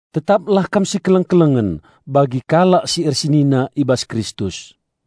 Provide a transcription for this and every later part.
Tetaplah kam sikeleng-kelengen bagi kalak si ersenina i bas Kristus.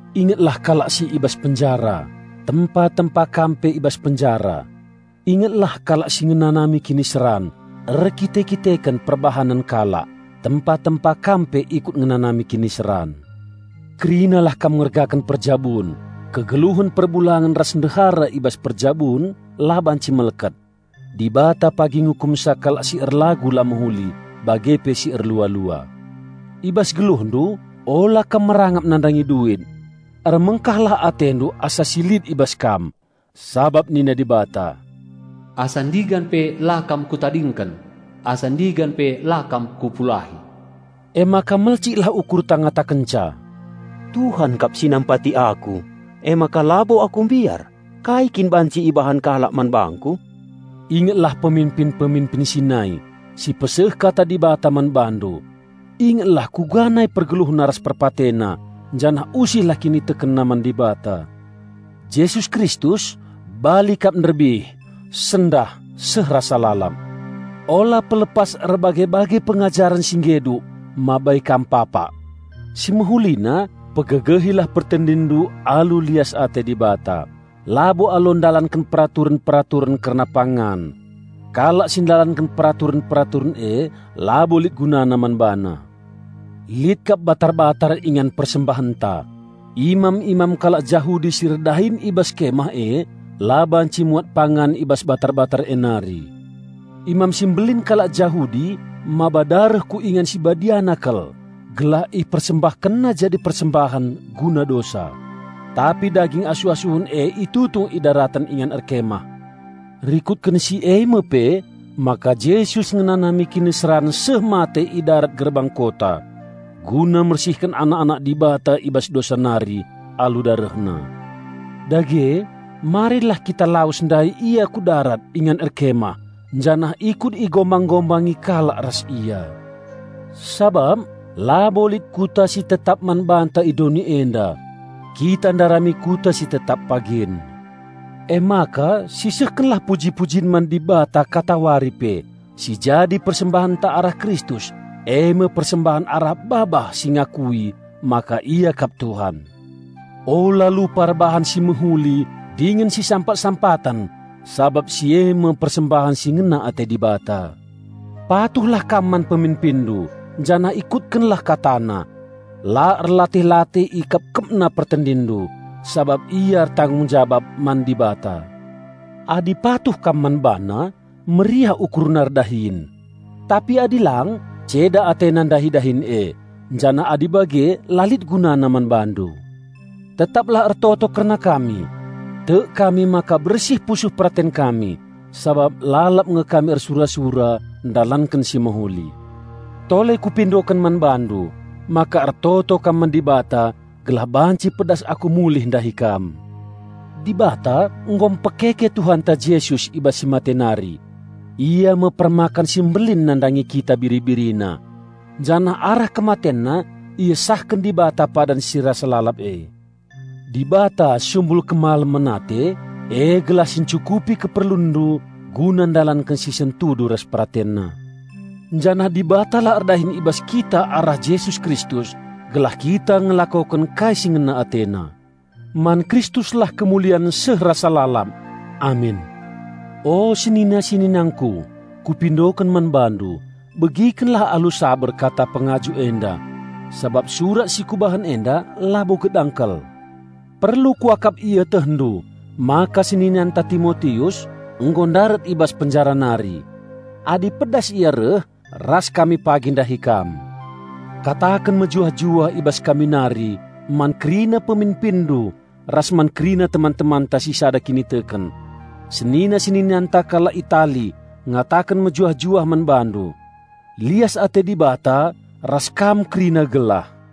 Ingetlah kalak si i bas penjara, tempa-tempa kam pe i bas penjara. Ingetlah kalak si ngenanami kiniseran erkite-kiteken perbahanen kalak, tempa-tempa kam pe ikut ngenanami kiniseran. Kerinalah kam ngergaken perjabun. Kegeluhen perbulangen ras ndehara i bas perjabun la banci melket. Dibata pagi ngukumsa kalak si erlagu la mehuli bage pe si erlua-lua. I bas geluhndu ula kam merangap nandangi duit. Ermengkahlah atendu asa si lit i bas kam. Sabap nina Dibata, "Asa ndigan pe la kam Kutadingken, asa ndigan pe la kam Kupulahi." Emaka melciklah ukurta ngatakenca, "Tuhan kap si nampati aku. Emaka labo aku mbiar. Kai kin banci ibahan kalak man bangku?" Ingetlah peminpin-peminpin si nai, si peseh Kata Dibata man bandu. Ingetlah kuga nai pergeluhna ras perpatena, janah usihlah kinitekenna man Dibata. Jesus Kristus bali kap nderbih, sendah, seh rasa lalap. Ula pelepas erbage-bage pengajaren si geduk mabai kam papak. Simehulina, pegegehilah pertendinndu alu lias ate Dibata, labo alu ndalanken peraturen-peraturen kerna pangan. Kalak si ndalanken peraturen-peraturen e, labo lit gunana man bana. Lit kap batar-batar ingan persembahenta; imam-imam kalak Jahudi si erdahin i bas Kemah e la banci muat pangan i bas batar-batar e nari. Imam si Mbelin kalak Jahudi mbaba dareh ku Ingan si Badiana kal gelah ipersembahkenna jadi persembahen guna dosa; tapi daging asuh-asuhen e itutung i daraten ingan erkemah. Rikutken si e me pe maka Jesus ngenanami kiniseran seh mate i darat gerbang kota, guna mersihken anak-anak Dibata i bas dosa nari alu DarehNa. Dage marilah kita lawes ndahi Ia ku darat ingan erkemah janah ikut igombang-gombangi kalak ras Ia. Sabap labo lit kuta si tetap man banta i doni enda; kita ndarami kuta si tetap pagin. Emaka sisehkenlah puji-pujin man Dibata katawari pe, si jadi persembahenta arah Kristus, e me persembahen arah babah si ngakui maka Ia kap Tuhan. Ula lupa erbahan si mehuli dingen sisampat-sampaten, sabap si e me persembahen si ngena ate Dibata. Patuhlah kam man peminpinndu janah ikutkenlah katana. La erlatih-latih ikepkepna pertendinndu, sabap ia ertanggung jabap man Dibata. Adi patuh kam man bana, meriah ukurna erdahin. Tapi adi lang, ceda atena ndahi dahin e, janah adi bage la lit gunana man bandu. Tetaplah ertoto kerna kami. Tek kami maka bersih pusuh peraten kami, sabap lalap nge kami ersura-sura ndalanken si mehuli. Tole kupindoken man bandu, maka ertoto kam man Dibata gelah banci pedas aku mulih ndahi kam. Dibata nggo mpekeke Tuhanta Jesus i bas si mate nari. Ia me Permakan Simbelin nandangi kita biri-BiriNa. Janah arah KematenNa iesahken Dibata padan si rasa lalap e. Dibata, sumbul kemalemen ate e gelah si ncukupi keperlunndu guna ndalanken si sentudu ras PeratenNa. Janah Dibatalah erdahin i bas kita arah Jesus Kristus gelah kita ngelakoken kai si ngena AteNa. Man Kristuslah kemulian seh rasa lalap. Amin. O senina-seninangku, kupindoken man bandu, begikenlah alu saber kata pengajuk enda; sabap surat si kubahan enda labo gedang kal. Perlu kuakap ietehndu maka seninanta Timotius nggo ndarat i bas penjara nari. Adi pedas ia reh, ras kami pagi ndahi kam. Kataken mejuah-juah i bas kami nari man kerina peminpinndu ras man kerina teman-temanta si sada kiniteken. Senina-seninanta kalak Itali ngataken mejuah-juah man bandu. Lias ate Dibata ras kam kerina gelah.